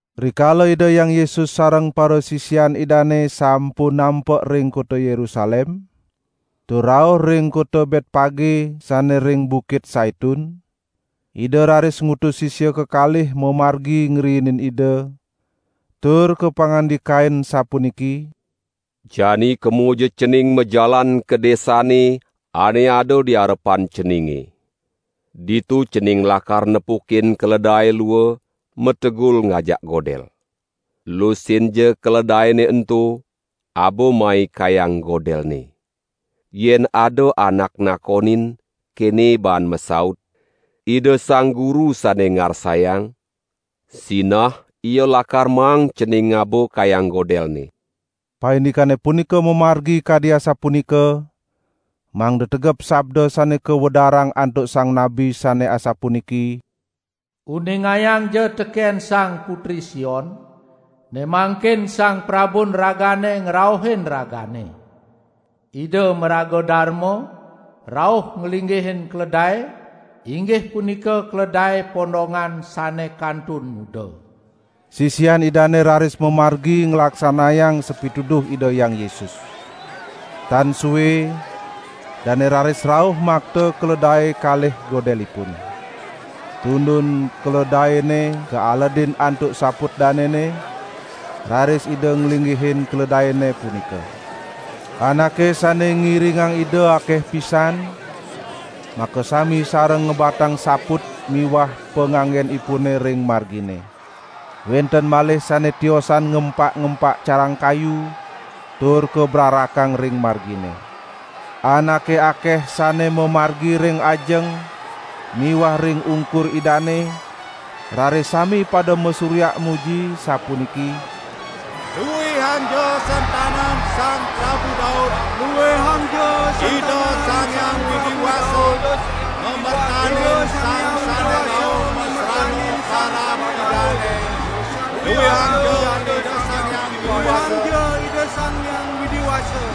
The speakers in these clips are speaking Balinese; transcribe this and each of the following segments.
Rikala Ida Hyang Yesus sareng parasisian Idane sampun nampek ring kota Yerusalem, tur rauh ring kota Betpage sane ring Bukit Saitun, Ida raris ngutus sisia kekalih mamargi ngriinin Ida, tur kapangandikain sapuniki: "Jani kemoja cening majalan ka desane ane ada di arepan ceninge. Ditu cening lakar nepukin keledae lua mategul ngajak godel. Lusinja keledaene ento, aba mai kayang godelne. Yen ada anak nakonin, kene baan masaut: 'Ida Sang Guru sane ngarsayang,' sinah ia lakar maang cening ngaba kayang godelne." Paindikane punika mamargi kadi asapunika mangda tegep sabda sane kawedarang antuk sang nabi sane asapuniki: "Uningayangja teken sang putri Sion: ne mangkin Sang Prabun ragane ngrauhin ragane. Ida maraga darma, rauh nglinggihin keledae inggih punika keledae pondongan sane kantun nguda!" Sisian Idane raris mamargi nglaksanayang sapituduh Ida Hyang Yesus. Tan sue, dane raris rauh makta keledae kalih godelipun. Tundun keledaene kaaledin antuk saput danene, raris Ida nglinggihin keledaene punika. Anake sane ngiringang Ida akeh pisan, makasami sareng ngebatang saput miwah panganggenipune ring margine. Wenten malih sane tiosan ngempak-ngempak carang kayu tur kabrarakang ring margine. Anake akeh sane mamargi ring ajeng miwah ring ungkur Idane raris sami pada masuryak muji sapuniki: "Luihangja sentanan Sang Prabu Daud, Ida Sang Hyang Widi Wasa ngamertanin Sang sane rauh masrana parab Idane. Luihangja Ida Sang Hyang Widi Wasa!"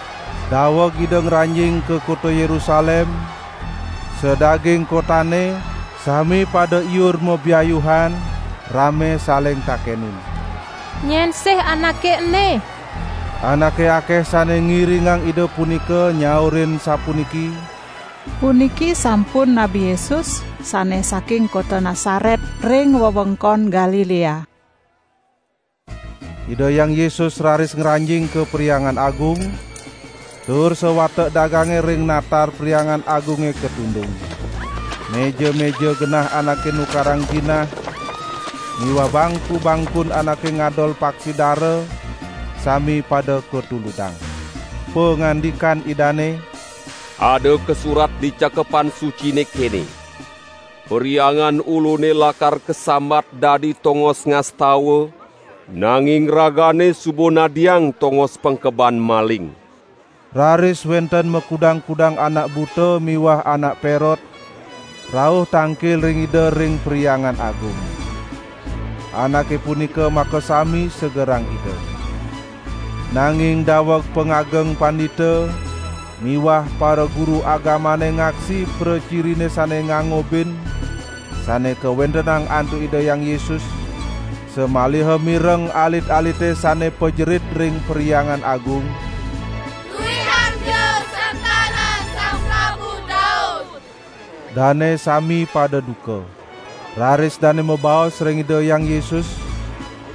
Daweg Ida ngranjing ka kota Yerusalem, sadaging kotane sami pada iur mabiayuhan rame saling takenin: "Nyen sih Anake ene?" Anake akeh sane ngiringang Ida punika nyaurin sapuniki: "Puniki sampun Nabi Yesus sane saking kota Nasaret ring wewengkon Galilea." Ida Hyang Yesus raris ngranjing ka Perhyangan Agung, tur sawatek dagange ring natar Perhyangan Agunge katundung. Meja-meja genah anake nukarang jinah miwah bangku-bangkun anake ngadol paksi dara sami pada katuludang. Pangandikan Idane: "Ada kasurat di Cakepan Sucine kene: 'Perhyangan Ulune lakar kasambat dadi tongos ngastawa,' nanging ragane suba nadiang tongos pengkeban maling." Raris wenten makudang-kudang anak buta miwah anak perot, rauh tangkil ring Ida ring Perhyangan Agung. Anake punika makasami segerang Ida. Nanging daweg pangageng pandita miwah paraguru agamane ngaksi pracirine sane ngangobin sane kawentenang antuk Ida Hyang Yesus, samaliha mireng alit-alite sane pajerit ring Perhyangan Agung: "Luihangja sentanan Sang Prabu Daud," dane sami pada duka. Raris dane mabaos ring Ida Hyang Yesus: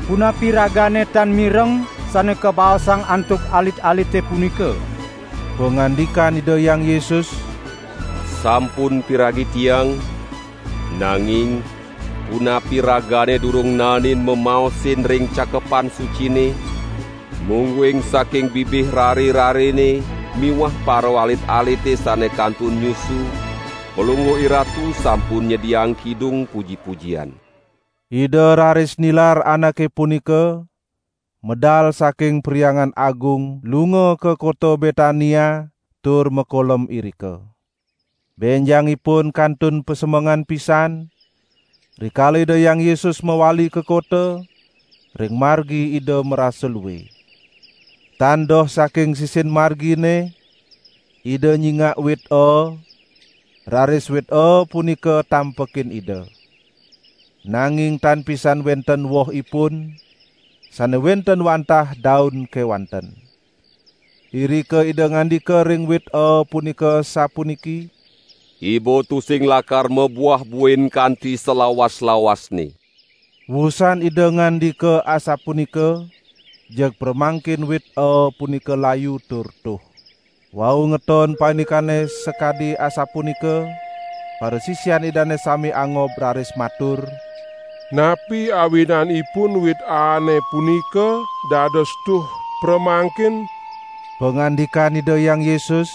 "Punapi Ragane tan mireng sane kabaosang antuk alit-alite punika." Pangandikan Ida Hyang Yesus: "Sampun piragi Tiang, nanging punapi ragane durung naenin mamaosin ring Cakepan Sucine: 'Mungguing saking bibih rare-rarene miwah paraalit-alite sane kantun nyusu, Palungguh IRatu sampun nyediaang kidung puji-pujian.'" Ida raris nilar anake punika, medal saking Perhyangan Agung lunga ka kota Betania tur makolem irika. Benjangipun kantun pasemengan pisan, rikala Ida Hyang Yesus mawali ka kota, ring margi Ida marasa lue. Tan doh saking sisin margine Ida nyingak wit aa, raris wit aa punika tampekin Ida. Nanging tan pisan wenten wohipun, sane wenten wantah daun kewanten. Irika Ida ngandika ring wit aa punika, sapuniki: "Iba tusing lakar mabuah buin kanti salawas-lawasne." Wusan Ida ngandika asapunika, jeg pramangkin wit aa punika layu tur tuh. Wau ngeton paindikane sakadi asapunika, parasisian Idane sami angob raris matur: "Napi awinanipun wit aane punika dados tuh pramangkin?" Pangandikan Ida Hyang Yesus: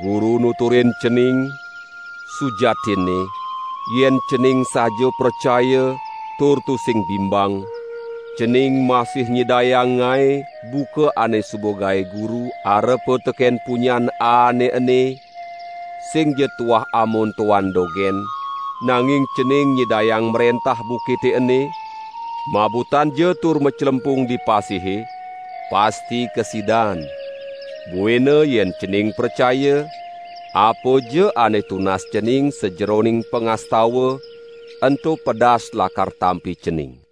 "Guru nuturin cening, sujatinne yen cening saja pracaya tur tusing bimbang, cening masih nyidayang ngae buka ane suba gae Guru arepa teken punyan aane ene, singja tuah amontoan dogen, nanging cening nyidayang mrentah bukite ene: 'Mabutanja tur maclempung di pasihe,' pasti kasidan! Buina yen cening pracaya, apaja ane tunas cening sajeroning pangastawan, ento pedas lakar tampi cening."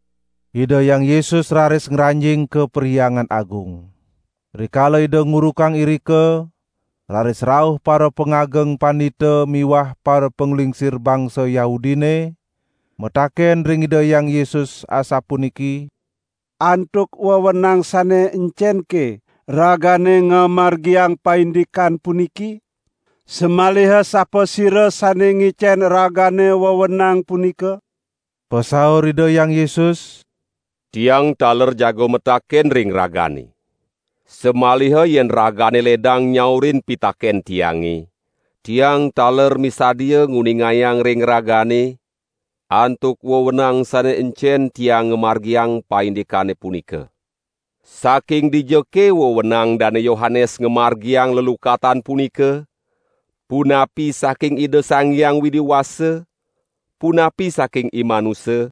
Ida Hyang Yesus raris ngranjing ka Perhyangan Agung. Rikala Ida ngurukang irika, raris rauh parapangageng pandita miwah parapanglingsir bangsa Yahudine, mataken ring Ida Hyang Yesus, asapuniki: "Antuk wewenang sane encenke Ragane ngamargiang paindikan puniki? Samaliha sapasira sane ngicen Ragane wewenang punika?" Pasaur Ida Hyang Yesus: "Tiang taler jaga mataken ring ragane. Samaliha yen ragane ledang nyaurin pitaken Tiange, Tiang taler misadia nguningayang ring ragane antuk wewenang sane encen Tiang ngamargiang paindikane punika. Saking dijake wewenang Dane Yohanes ngamargiang lelukatan punika? Punapi saking Ida Sang Hyang Widi Wasa, punapi saking imanusa?"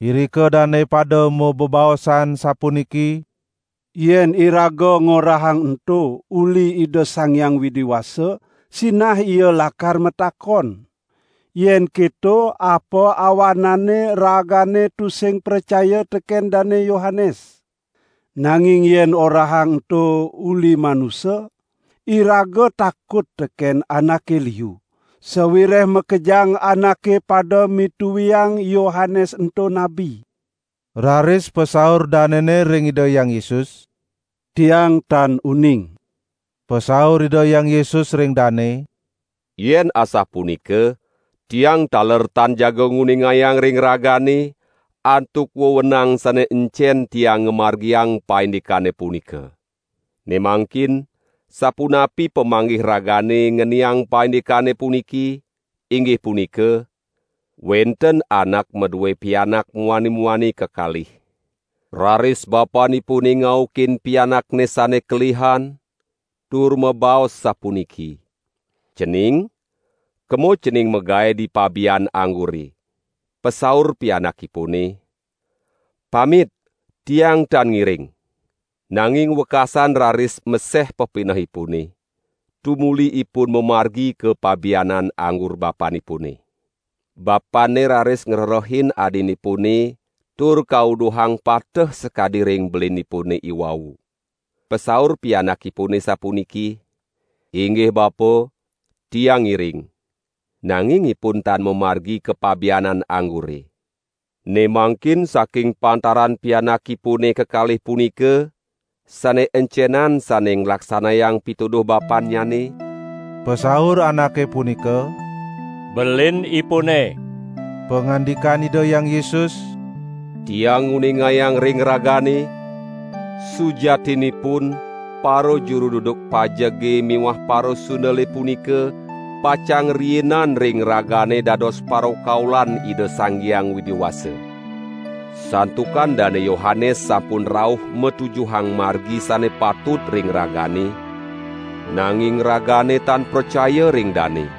Irika dane pada mabebaosan sapuniki: "Yen iraga ngorahang ento uli Ida Sang Hyang Widi Wasa, sinah Ia lakar matakon: 'Yen keto apa awananne ragane tusing pracaya teken Dane Yohanes.' Nanging yen orahang ento 'uli manusa', iraga takut teken anake liu, sawireh makejang anake pada mituiang Yohanes ento nabi." Raris pasaur danene ring Ida Hyang Yesus: "Tiang tan uning." Pasaur Ida Hyang Yesus ring dane: "Yen asapunika, Tiang taler tan jaga nguningayang ring ragane, antuk wewenang sane encen Tiang ngamargiang paindikane punika." "Ne mangkin sapunapi pamanggih ragane ngeniang paindikane puniki, inggih punika: Wenten anak madue pianak muani-muani kekalih. Raris bapanipune ngaukin pianakne sane paling keliha tur mabaos sapuniki: 'Cening kemo cening magae di pabianan anggure.' Pasaur pianakipune: 'Pamit tiang tan ngiring.' Nanging wekasan raris meseh pepinehipune, tumuli ipun mamargi ka pabianan anggur bapanipune. Bapanne raris ngrerehin adinipune tur kauduhang pateh sakadi ring belinipune iwau. Pasaur pianakipune sapuniki: 'Inggih bapa, tiang ngiring!' Nanging ipun tan mamargi ka pabianan anggure. Ne mangkin saking pantaran pianakipune kekalih punika, sane encenan sane nglaksanayang pituduh bapannyane?" Pasaur anake punika: "Belinipune." Pangandikan Ida Hyang Yesus: "Tiang nguningayang ring ragane, sujatinipun parajuru duduk pajege miwah parasundele punika pacang riinan ring ragane dados parakaulan Ida Sang Hyang Widi Wasa. Santukan Dane Yohanes sampun rauh matujuhang margi sane patut ring ragane, nanging ragane tan pracaya ring dane.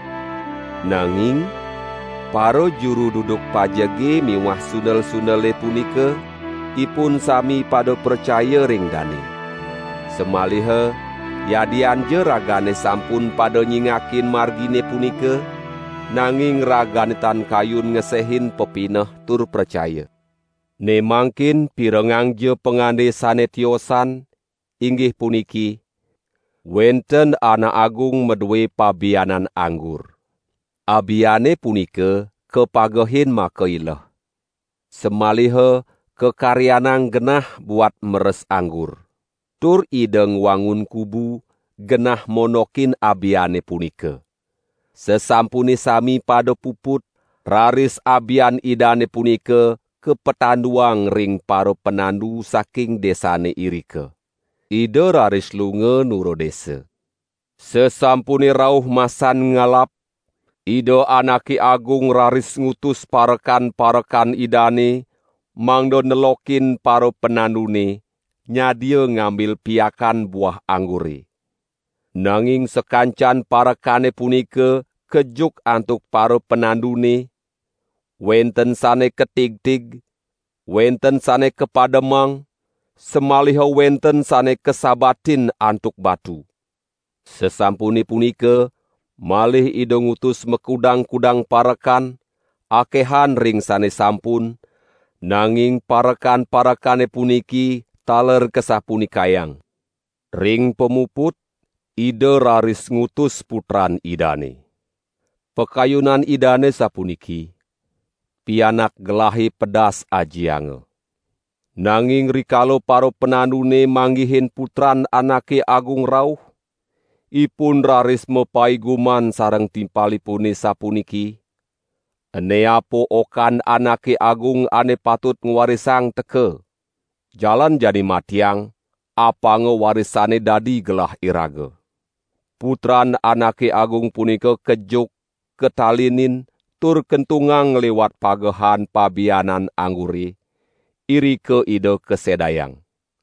Nanging parajuru duduk pajege miwah sundel-sundele punika, ipun sami pada pracaya ring dane. Samaliha yadianja ragane sampun pada nyingakin margine punika, nanging ragane tan kayun ngesehin pepineh tur pracaya." "Ne mangkin pirengangja pangande sane tiosan, inggih puniki: Wenten anak agung madue pabianan anggur. Abiane punika kapagehin makaileh. Samaliha kakaryanang genah buat meres anggur. Tur ida ngwangun kubu, genah mondokin abiane punika. Sasampune sami pada puput, raris abian idane punika kapatanduang ring parapanandu saking desane irika. Ida raris lunga nura desa. Sasampune rauh masan ngalap, ida anake agung raris ngutus parekan-parekan idane mangda nelokin parapanandune, nyadia ngambil piakan buah anggure. Nanging sakancan parekane punika kejuk antuk parapanandune, wenten sane katigtig, wenten sane kapademang, samaliha wenten sane kasabatin antuk batu. Sasampune punika malih Ida ngutus makudang-kudang parekan, akehan ring sane sampun, nanging parekan-parekane puniki taler kasapunikayang. Ring pamuput, ida raris ngutus putran idane. Pakayunan idane sapuniki: 'Pianak gelahe pedas ajianga.' Nanging rikala parapanandune manggihin putran anake agung rauh, ipun raris mapaiguman sareng timpalipune sapuniki: 'Ene apa okan anake agung ane patut ngwarisang teka. Jalan jani matiang, apanga warisane dadi gelah iraga.' Putran anake agung punika kejuk katalinin, tur kentungang ngliwat pagehan pabianan anggure, irika ida kasedayang.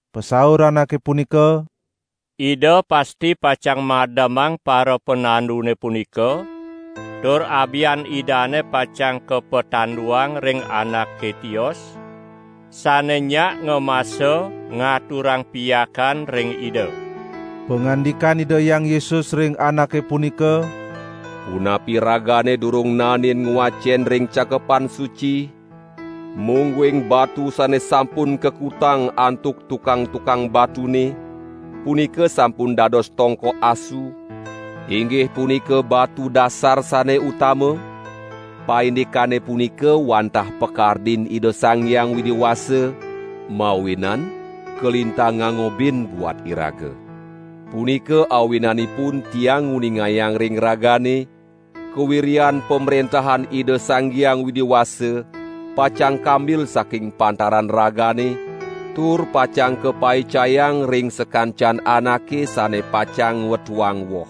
Pasaur anake punika: "Ida pasti pacang mademang parapanandune punika tur abian idane pacang kapatanduang ring anake tios, sane nyak ngamasa ngaturang piakan ring ida." Pangandikan Ida Hyang Yesus ring anake punika: "Punapi ragane durung naenin ngwacen ring Cakepan Suci mungguing batu sane sampun kakutang antuk tukang-tukang batune, punika sampun dados tongkok asu, inggih punika batu dasar sane utama. Paindikane punika wantah pakardin Ida Sang Hyang Widi Wasa, mawinan kalintang ngangobin buat iraga. Punika awinanipun Tiang nguningayang ring ragane, kawiryan Pamrentahan Ida Sang Hyang Widi Wasa pacang kambil saking pantaran ragane tur pacang kapaicayang ring sakancan anake sane pacang ngwetuang woh. [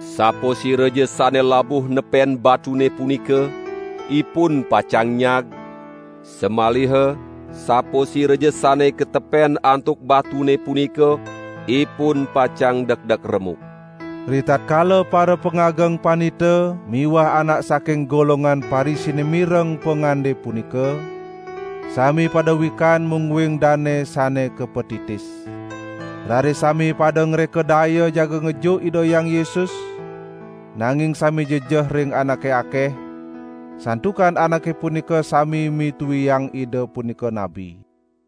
Sapasiraja sane labuh nepen batune punika, ipun pacang nyag, samaliha sapasiraja sane katepen antuk batune punika, ipun pacang dekdek remuk.]" Ritatkala parapangageng pandita miwah anak saking golongan Parisine mireng pangande punika, sami pada wikan mungguing dane sane kapatitis. Raris sami pada ngreka daya jaga ngejuk Ida Hyang Yesus, nanging sami jejeh ring anake akeh, santukan anake punika sami mituiang Ida punika nabi.